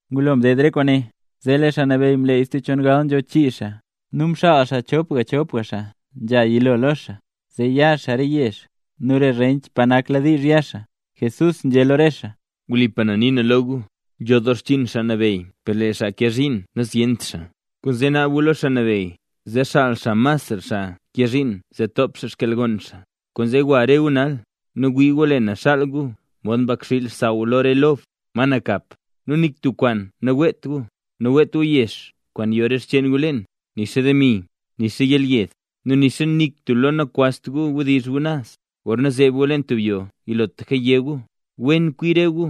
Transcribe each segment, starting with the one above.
Ngulo mded re kwaane, zee lee Xaa Nabeyy mleey stub chongal nzho chii xaa, nu mxaal xaa chopga chopga xaa nzha yilo lo xaa, zee ya xaa re yezh nu re rench pa nak diizh ya xaa. Jesús nzhé lo re xaa: —Wlipa na nii na lo gu, nzho doo xchiin Xaa Nabeyy per lee xaa nkee zhiin nazyent xaa. Kwaanzee naab gu lo Xaa Nabeyy, zee xaal xaa masra xaa kee zhiin zee top xkyalgon xaa. Kwaanzee gwa re gu nal; nu wii gu lee na xaal gu mod mbakxiil xsaww lo re lob, ma nakap. Nu nik tub kwaan naweet gu: naweet gu yex kwaan yo re xcheen gu leen, nixa demi, nixa yelyed; nu nixa nik tub lo nakwazt gu wdizh gu naz. Gorna zeeb gu leen tub yoo yilotlaka yé gu: “Wen kwi re gu,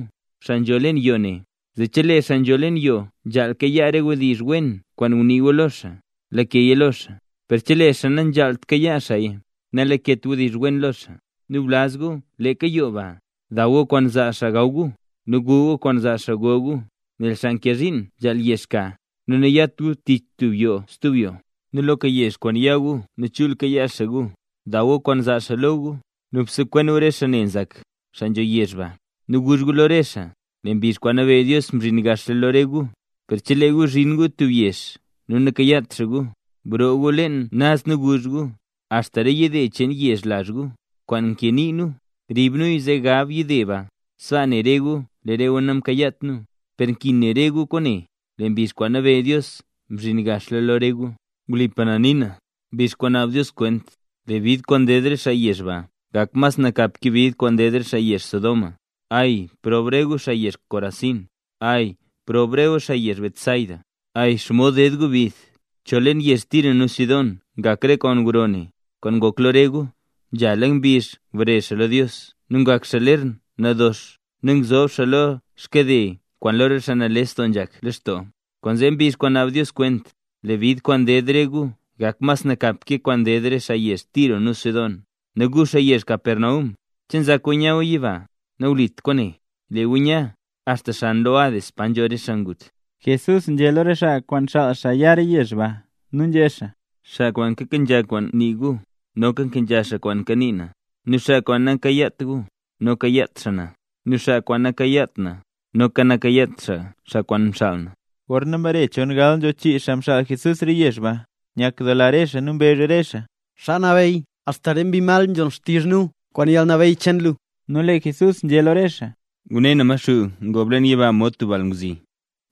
xaa nzho leen yoo ne”. Zee chelee xaa nzho leen yoo nzhaal kayaa re wdizh wen kwaan ngunii gu lo xaa, lakeya lo xaa, per chelee xaa nanzhaalt kayaa xaaya, nalaket wdizh wen lo xaa. Nu blaz gu leeka yoo baa, daw gu kwaan zaa xaa gaw gu, nu gu gu kwaan zaa xaa go gu, nel xaa nkee zhiin nzhaal yex ka. Nu nayat gu tich tub yoo stub yoo. Nu loka yezh kwaan ya gu nu chul kayaa xaa gu, daw gu kwaan zaa xaa lo gu. Nu bsekwen gu re xaa ne nzak, xaa nzho yezh ba, nu guzh gu lo re xaa: “Lee mbizh kwaan nabeyy Dios mzhin gaxla lo re gu”. Per chelee gu zhin gu tub yezh nu nakayaat xaa gu, broo gu leen naz nu guzh gu: “Axta re yide cheen yezh lazh gu, kwaan mkee nii nu, rib nuya zee gab yide ba, sbaa ne re gu lee re gu namkayaat nu. Per nkin ne re gu kwaane: Lee mbizh kwaan nabeyy Dios mzhin gaxla lo re gu.” Wlipa na nii na, mbizh kwaan naab Dios kwent, lee bid kwaan ded re xaa yezh ba gak mas nakap ke bid kwaan ded re xaa yezh Sodoma. ’¡Ay, proob re gu xaa yezh Corazín! ¡Ay proob re gu xaa yezh Betsaida! ¡Ay, xomod ded gu bid! Chol leen yezh Tiro nu Sidón ngak re kwaan gro ne, kwaan ngok lo re gu, nzhala mbizh ngbare xaa lo Dios nu ngak xaa ler nadox nu ngzob xaa lo xkade kwaan lu lee xaa nales doo nzhak lextoo. Kwaanzee mbizh kwaan naab Dios kwent, lee bid kwaan ded re gu gak mas nakapra ke kwaan ded re xaa yezh Tiro nu Sidón. Nu gu, xaa yezh Capernaum, ¿che nzak gu nya gu yiba? ¡Nawlit kwaane, lee gu nya axta xan lo Hades pa nzho re xaa ngut! Jesús nzhé lo re xaa kwaan xaal xaa ya re yezh ba, nu nzhé xaa: —Xaa kwaan nkenzha kwaan nii gu, noka nkenzha xaa kwaan nii na; nu xaa kwaan nakayaat gu, noka nakayaat xaa na; nu xaa kwaan nakayaat na, noka nakayaat xaa xaa kwaan mxaal na. Gorna mbare chongal nzho chii xaa mxaal Jesús re yezh ba, nyakdoola re xaa nu mbezh re xaa: —Xaa Nabeyy, axta re mbi mal nzhon xtizh nu kwaan yalnabeyy cheen lu. Nu lee Jesús nzhé lo re xaa: —Ngune na lee Maxuu ngob leen yiba mod tub balngwzi.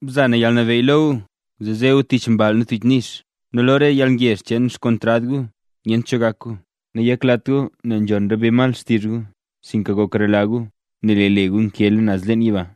Mza na yalnabeyy lo re gu zee ze gu tich mball nu tich nix, nu lo rese yalngezh cheen xkontrad gu nu nyent cho gak gu. Nu nayaklat gu nel nzhon re mbi mal xtizh gu, sinka goklara gu nel lee le re gu nkeela naz leen yiba.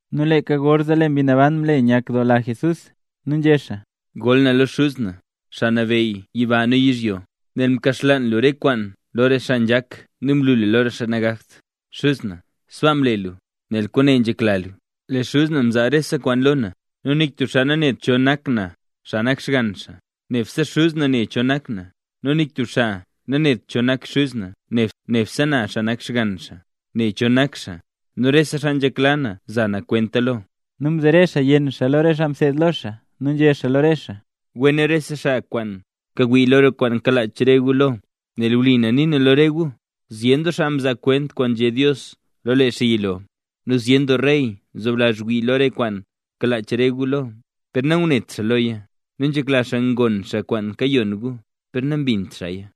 Nu leeka gorzee lee Mbi Naban mle nyakdoola Jesús nu nzhé xaa: —Goll na lo lu Xuz na, Xaa Nabeyy yiba nu yizhyo; nel mkaxlaan lu re kwaane lo re xaa nzhak nu mlu luya lo re xaa nagakt. Xuz na sbaa mle luya, nel kwaane nzhekla lu. ’Lee Xuz na mzaa rese kwaan lo na. Nu nik tub xaa nanet cho nak na, xaa nak Xgann xaa, nebse Xuz na ne cho nak na. Nu nik tub xaa nanet cho nak Xuz na, nebse na, xaa nak Xgann xaa, ne cho nak xaa, nu re xaa nzhekla na za na kwenta lo. Nu mzere xaa yenn xaa lo re xaa mseed lo xaa, nu nzhé xaa lo re xaa: —Wen rese xaa kwaan kawii lo re kwaan kalach re gu lo. Nel wli na nii na lo re gu, zyen doo xaa mzaa kwent kwaan nzhé Dios lo lee xaa yilo nu zyen doo rey mzoblazh ngwii re kwaan kalach re gu lo, per nangunet xaa loya, nu nzhekla xaa ngon xaa kwaan kayon gu per nambint xaaya.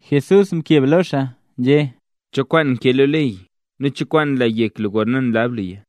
Jesús mkeb lo xaa, nzhé: —¿Cho kwaan nkee lo ley? ¿Nu cho kwaan nla yek lu gorna nlab luya?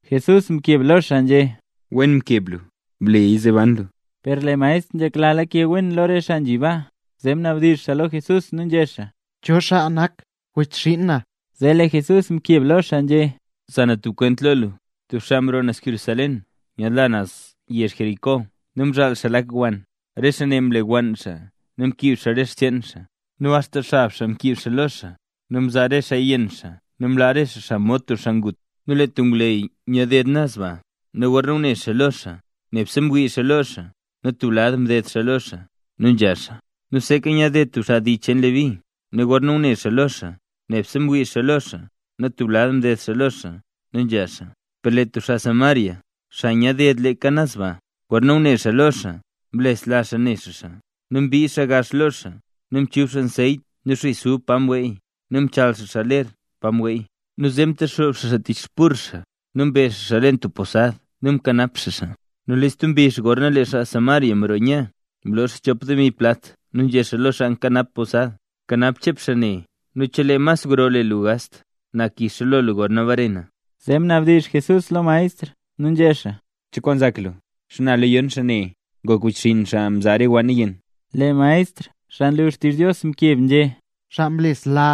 Jesús mkeb lo xaa nzhé: —Wen mkeb lu, bleya zee ban lu. Per lee maestr nzhekla lake wen lo re xaa nzhi baa, zee mnabdizh xaa lo Jesús nu nzhé xaa: —¿Cho xaa nak wechxinn na? Zee lee Jesús mkeb lo xaa nzhé: —Za na tub kwent lo lu. Tub xaa mroo naz Jerusalén nyaadla naz yezh Jericó nu mzhaal xaa lak wann, re xaa ne mlewann xaa nu mkiib xaa re xcheen xaa nu axta xab xaa mkiib xaa lo xaa, nu mzaa re xaa yenn xaa nu mlaa re xaa xaa mod tub xaa ngut. Nu lee tub ngwleyy nyaad ded naz baa. Nu gorna ngune xaa lo xaa, nebse mwii xaa lo xaa nu tub lad mded xaa lo xaa, nu nzha xaa. Nu seeka nyaad ded tub xaa dii cheen Leví, nu gorna ngune xaa lo xaa, nebse mwii xaa lo xaa nu tub lad mded xaa lo xaa, nu nzha xaa. Per tub xaa Samaria, xaa nyaad ded leeka naz ba, gorna ngune xaa lo xaa mlesla xaa ne xaa xaa. Nu mbii xaa gax lo xaa, nu mchub xaa anseyt nu xis ub pa mweey, nu mchaal xaa ler pa mweey. Nu zee mtexoob xaa xaa tich xburr xaa nu mbe xaa xaa leen tub posad nu mkanap xaa xaa. Nu stub mbizh gorna lee xaa Samaria roo nya, mloo xaa chop demi plat nu nzhé xaa lo xaa nkanap posad: “Bkanap chep xaa ne nu chelee mas gro le lu gast, na kixa lo lu gorna bare na”. Zee mnabdizh Jesús lo maestr nu nzhé xaa: —¿Cho kwaan nzak lu? ¿Xana lo yon xaa ne ngok wechxinn xaa mzaa re wann yenn? Lee maestr xaa nlu xtizh Dios mkeb nzhé: —Xaa mlesla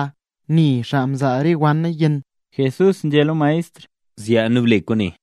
ne xaa mzaa re wanna yenn. Jesús nzhé lo maestr: —Zyaa nu ble kwaane.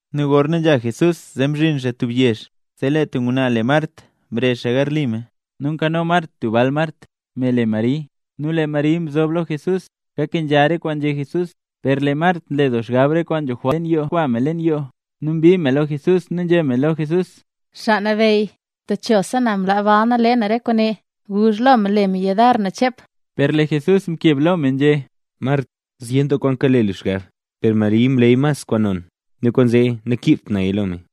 Nu gorna nzha Jesús zee mzhin xaa tub yezh; zee lee tub ngwnaa le Mart mrezh xaa garli me. Nu nkano Mart tub bal Mart, me le Mari. Nu lee Mari mzob lo Jesús, kakenzha re kwaan nzhé Jesús. Per lee Mart nle doo xgab re kwaan nzho jwalt dexkwaa me leen yoo, nu mbii me lo Jesús nu nzhé me lo Jesús: —Xaa Nabeyy, techosa na mlaa bal na le na re kwaane. Guzh lo me le me yudar na chep. Per lee Jesús mkeb lo me nzhé: —Mart, zyen doo kwaan kale lu xgab, per Mari mleey kwaan mas non, nu kwaanzee nakiibt naya lo me.